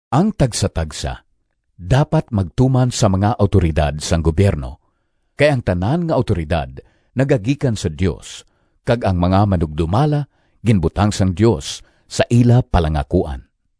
Ang tagsatagsa dapat magtuman sa mga awtoridad sang gubyerno kay ang tanan nga awtoridad nagagikan sa Dios kag ang mga manugdumala ginbutang sang Dios sa ila palangakuan.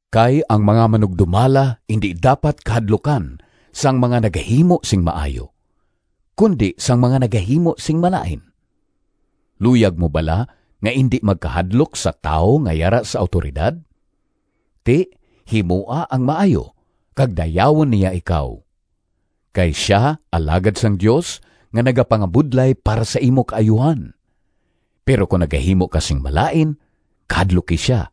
Kay ang mga manugdumala indi dapat kahadlukan sang mga nagahimo sing maayo, kundi sang mga nagahimo sing malain. Luyag mo bala nga indi magkahadlok sa tawo nga yara sa awtoridad? Ti, himoa ang maayo, kag dayawon niya ikaw. Kay sia alagad sang Dios nga nagapangabudlay para sa imo kaayuhan. Pero kon nagahimo ka sing malain, kahadluki sia,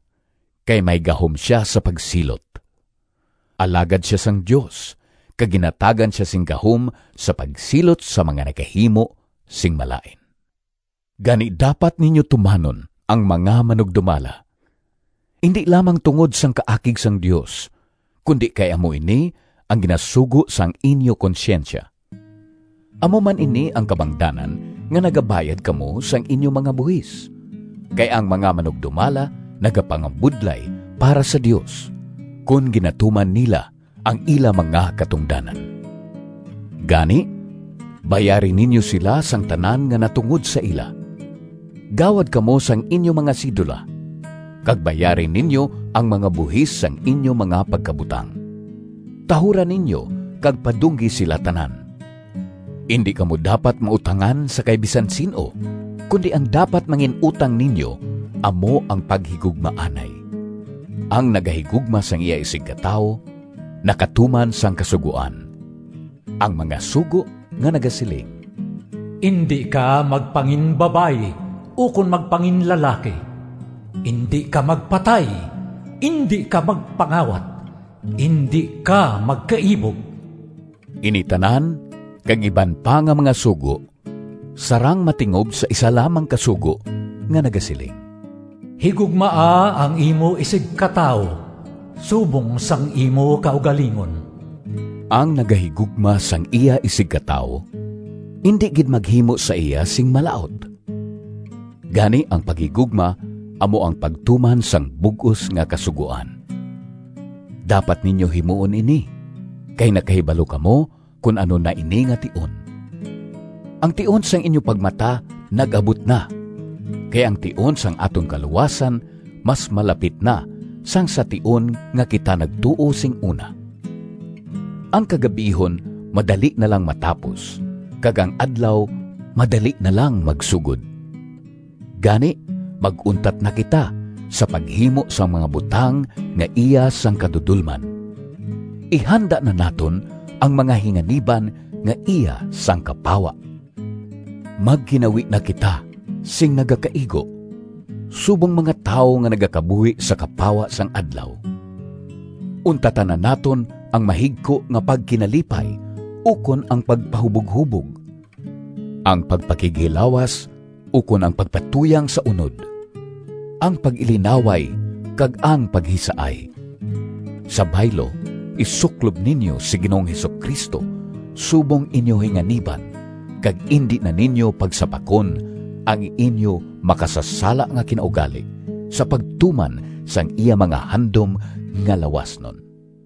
kay may gahom sia sa pagsilot. Alagad sia sang Dios kag ginhatagan sia sing gahom sa pagsilot sa mga nagahimo sing malain. Gani, dapat ninyo tumanon ang mga manugdumala, indi lamang tungod sang kaakig sang Dios, kundi kay amo ini ang ginasugo sang inyo konsyensya. Amo man ini ang kabangdanan nga nagabayad kamo sang inyo mga buhis, kay ang mga manugdumala nagapangabudlay para sa Dios, kon ginatuman nila ang ila mga katungdanan. Gani, bayari ninyo sila sang tanan nga natungod sa ila. Gawad kamo sang inyo mga sidula, kag bayari ninyo ang mga buhis sang inyo mga pagkabutang. Tahura ninyo kag padunggi sila tanan. Indi kamo dapat mautangan sa kay bisan sin-o, kundi ang dapat mangin-utang ninyo amo ang paghigugmaanay. Ang nagahigugma sang iya isigkatawo nakatuman sang Kasugoan. Ang mga sugo nga nagasiling, “Indi ka magpanginbabayi ukon magpanginlalaki, indi ka magpatay, indi ka magpangawat, indi ka magkaibog,” ini tanan kag iban pa nga mga sugo sarang matingob sa isa lamang ka sugo nga nagasiling, “Higugmaa ang imo isigkatawo subong sang imo kaugalingon.” Ang nagahigugma sang iya isigkatawo indi gid maghimo sa iya sing malaut. Gani, ang paghigugma amo ang pagtuman sang bug-os nga Kasugoan. Dapat ninyo himuon ini, kay nakahibalo kamo kon ano na ini nga tion. Ang tion sang inyo pagmata nag-abot na. Kay ang tion sang aton kaluwasan mas malapit na sang sa tion nga kita nagtuo sing una. Ang kagab-ihon madali na lang matapos kag ang adlaw madali na lang magsugod. Gani, mag-untat na kita sa paghimo sang mga butang nga iya sang kadudolman. Ihanda na naton ang mga hinganiban nga iya sang kapawa. Magginawi na kita sing nagakaigo subong mga tawo nga nagakabuhi sa kapawa sang adlaw. Untatan na naton ang mahigko nga pagkinalipay ukon ang pagpahuboghubog, ang pagpakighilawas ukon ang pagpatuyang sa unod, ang pag-ilinaway kag ang paghisaay. Sa baylo, isuklob ninyo si Ginoong Jesu-Cristo subong inyo hinganiban, kag indi na ninyo pagsapakon ang inyo makasasala nga kinaugali, sa pagtuman sang iya mga handom nga lawasnon.